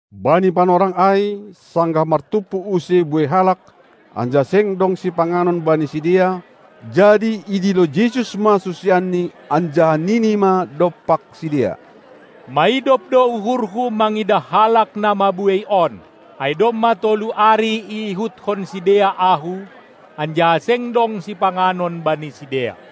Bani panorang ai, sanggah martumpu use buei halak, anjaha seng dong sipanganon bani sidea, jadi idilo Jesus ma susianNi anjaha nini ma dompak sidea: Maidop do uhurHu mangidah halak na mabuei on, ai domma tolu ari iihutkon sidea Ahu, anjaha seng dong sipanganon bani sidea.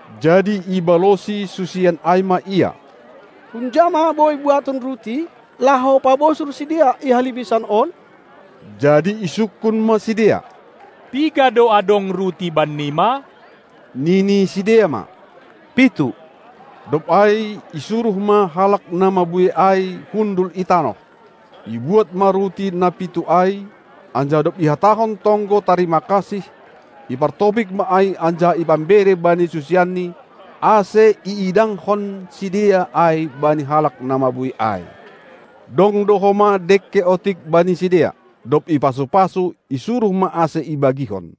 Jadi ibalosi susian ai ma Ia: Hunja ma boi buaton ruti, laho pabosur sidea i halimisan on? Jadi isungkun ma sidea: Piga do adong ruti bannima? Nini sidea ma: Pitu! Dob ai isuruh ma halak na mabuei ai hundul i tanoh. Ibuat ma ruti na pitu ai, anjaha dob ihatahon tonggo tarima kasih, ipartopik ma ai anjaha ipambere bani susianNi, ase iidangkon sidea ai bani halak na mabuei ai. Dong do homa dengke otik bani sidea. Dob ipasu-pasu, isuruh ma ase ibagihon.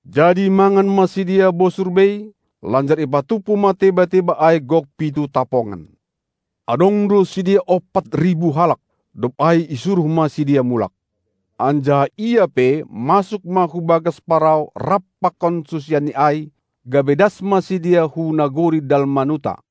Jadi mangan ma sidea bosur bei, lanjar ipatumpu ma teba-teba ai gok pitu tapongan. Adong do sidea ompat ribu halak. Dob ai isuruh ma sidea mulak, anjaha Ia pe, masuk ma hu bagas parau rap pakon susianNi ai, gabe das ma sidea hu nagori Dalmanuta.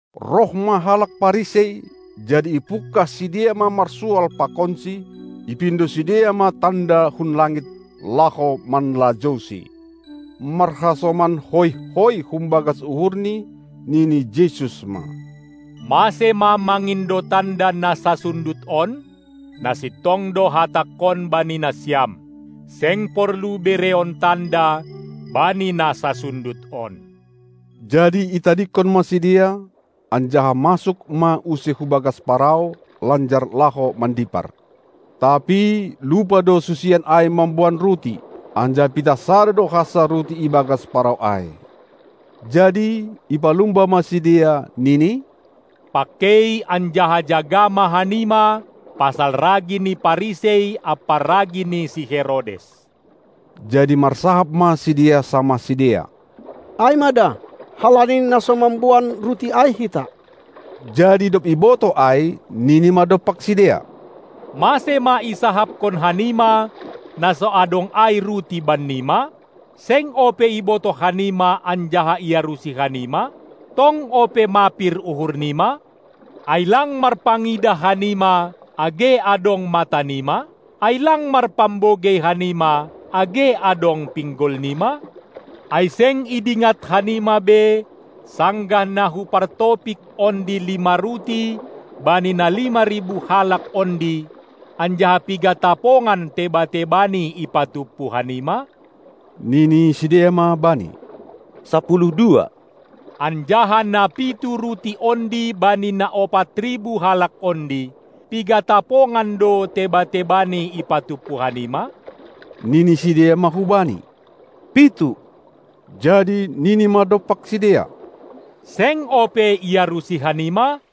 Roh ma halak Parisei, jadi ipungkah sidea ma marsual pakonSi. Ipindo sidea ma tanda hun langit, laho manlajouSi. Marhasoman hoih-hoih humbagas uhurNi, nini Jesus ma: Mase ma mangindo tanda na sasundut on? Na sintong do Hatangkon bani nasiam: Seng porlu bereon tanda bani na sasundut on! Jadi itadingkon ma sidea, anjaha masuk ma use hubagas parau, lanjar laho mandipar. Tapi lupa do susian ai mamboan ruti, anjaha pitah sada do hansa ruti i bagas parau ai. Jadi ipalumba ma sidea, nini: Pangkei anjaha jaga ma hanima pasal ragi ni Parisei ampa ragi ni si Herodes. Jadi marsahap ma sidea samah sidea: Ai ma da, halani na so mamboan ruti ai hita. Jadi dob ibotoh ai nini ma dompak sidea: Mase ma isahapkon hanima, na so adong ai ruti bannima? Seng ope ibotoh hanima anjaha iarusi hanima? Tong ope mapir uhur nima? Ai lang marpangidah hanima, age adong mata nima? Ai lang marpambogei hanima, age adong pinggol nima? Ai seng idingat hanima be sanggah na Hupartopik ondi lima ruti bani na lima ribu halak ondi, anjaha piga tapongan teba-tebani ipatumpu hanima? Nini sidea ma Bani: Sapuluh dua. Anjaha na pitu ruti ondi bani na ompat ribu halak ondi, piga tapongan do teba-tebani ipatumpu hanima? Nini sidea ma hu Bani: Pitu! Jadi nini ma dompak sidea: Seng ope iarusi hanima?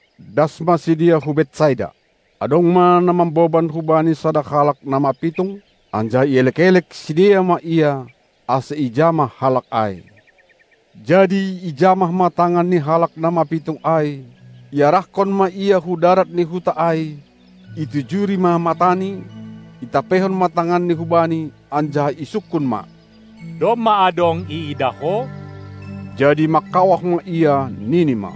Das ma sidea hu Betsaida. Adong ma na mamboban hu Bani sada halak na mapitung, anjaha ielek-elek sidea ma Ia, ase ijamah halak ai. Jadi ijamah ma tangan ni halak na mapitung ai, iarahkon ma ia hu darat ni huta ai, itijuri ma matani, itampeihon ma tanganni hubani, anjaha isungkun ma: Domma adong iidah ho? Jadi mangkawah ma ia, nini ma: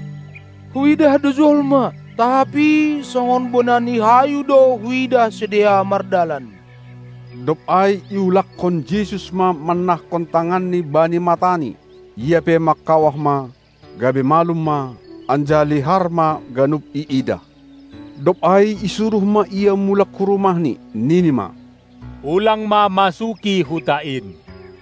Huidah do jolma, tapi songon bona ni hayu do huidah sidea mardalan. Dob ai iulakkon Jesus ma mannahkon tanganNi bani matani; ia pe mangkawah ma, gabe malum ma, anjaha lihar ma ganup iidah. Dob ai isuruh ma ia mulak hu rumahni, nini ma: Ulang ma masuki huta in.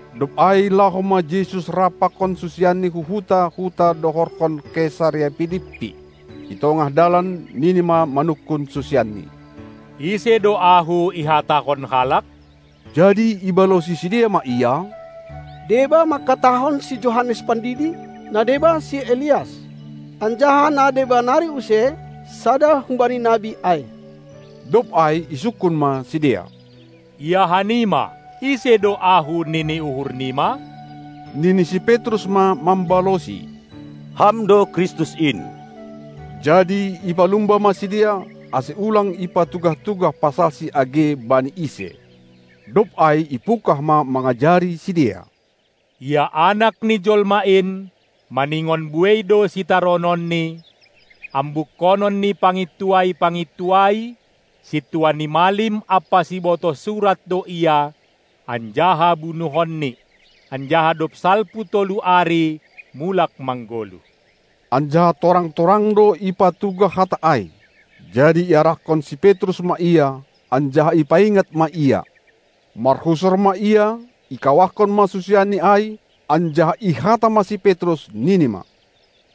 Dob ai laho ma Jesus rap pakon susianNi hu huta-huta dohorhon Kesarea Pilippi. I tongah dalan Nini ma manungkun susianNi: Ise do Ahu ihatahon halak? Jadi ibalosi sidea ma Ia: Deba mangkatahon si Johannes Pandidi, na deba si Elias, anjaha na deba nari use, sada humbani nabi ai. Dob ai isungkun ma sidea: Ia hanima, ise do Ahu nini uhur nima? Nini si Petrus ma mambalosi: Ham do Kristus in! Jadi ipalumba ma sidea, ase ulang ipatugah-tugah pasalSi age bani ise. Dob ai ipungkah ma mangajari sidea: Ia anak ni jolma in, maningon buei do sitarononNi, ambukkonon ni pangintuai-pangintuai, sintua ni malim ampa sibotoh surat do Ia, anjaha bunuhonni, anjaha dob salpu tolu ari mulak manggoluh. Anjaha torang-torang do ipatugah hata ai. Jadi iarahkon si Petrus ma Ia, anjaha ipaingat ma Ia. Marhusor ma Ia, ikawahkon ma susianNi ai, anjaha ihata ma si Petrus, nini ma: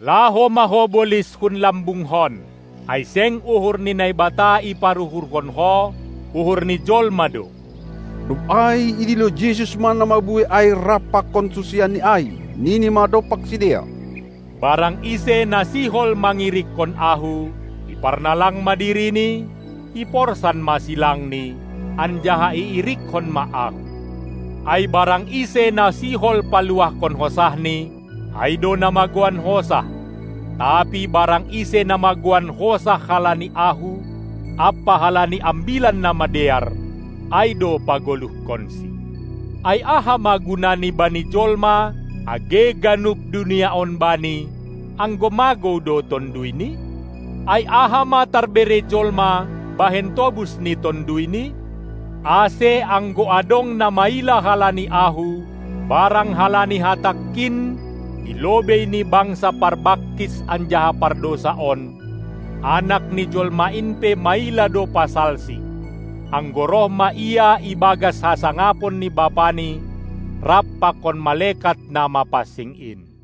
Laho ma ho bolis hun lambungkon! Ai seng uhur ni Naibata iparuhurhon ho, uhur ni jolma do. Dob ai idilo Jesus ma na mabuei ai rap pakon susianNi ai, nini ma dompak sidea: Barang ise na sihol mangirikkon Ahu, iparnalang ma dirini, iporsan ma silangni, anjaha iirikkon ma Ahu. Ai barang ise na sihol paluahkon hosahni, ai do na magouan hosah, tapi barang ise na magouan hosah halani Ahu ampa halani Ambilan Namadear, ai do pagoluhkonsi. Ai aha ma gunani bani jolma, age ganup dunia on bani, anggo magou do tonduyni? Ai aha ma tarbere jolma, bahen tobus ni tonduyni? Ase anggo adong na maila halani Ahu barang halani Hatangkin i lobei ni bangsa parbangkis anjaha pardousa on, Anak ni jolma in pe maila do pasalsi, anggo roh ma Ia i bagas hasangapon ni BapaNi rap pakon malekat na mapansing in.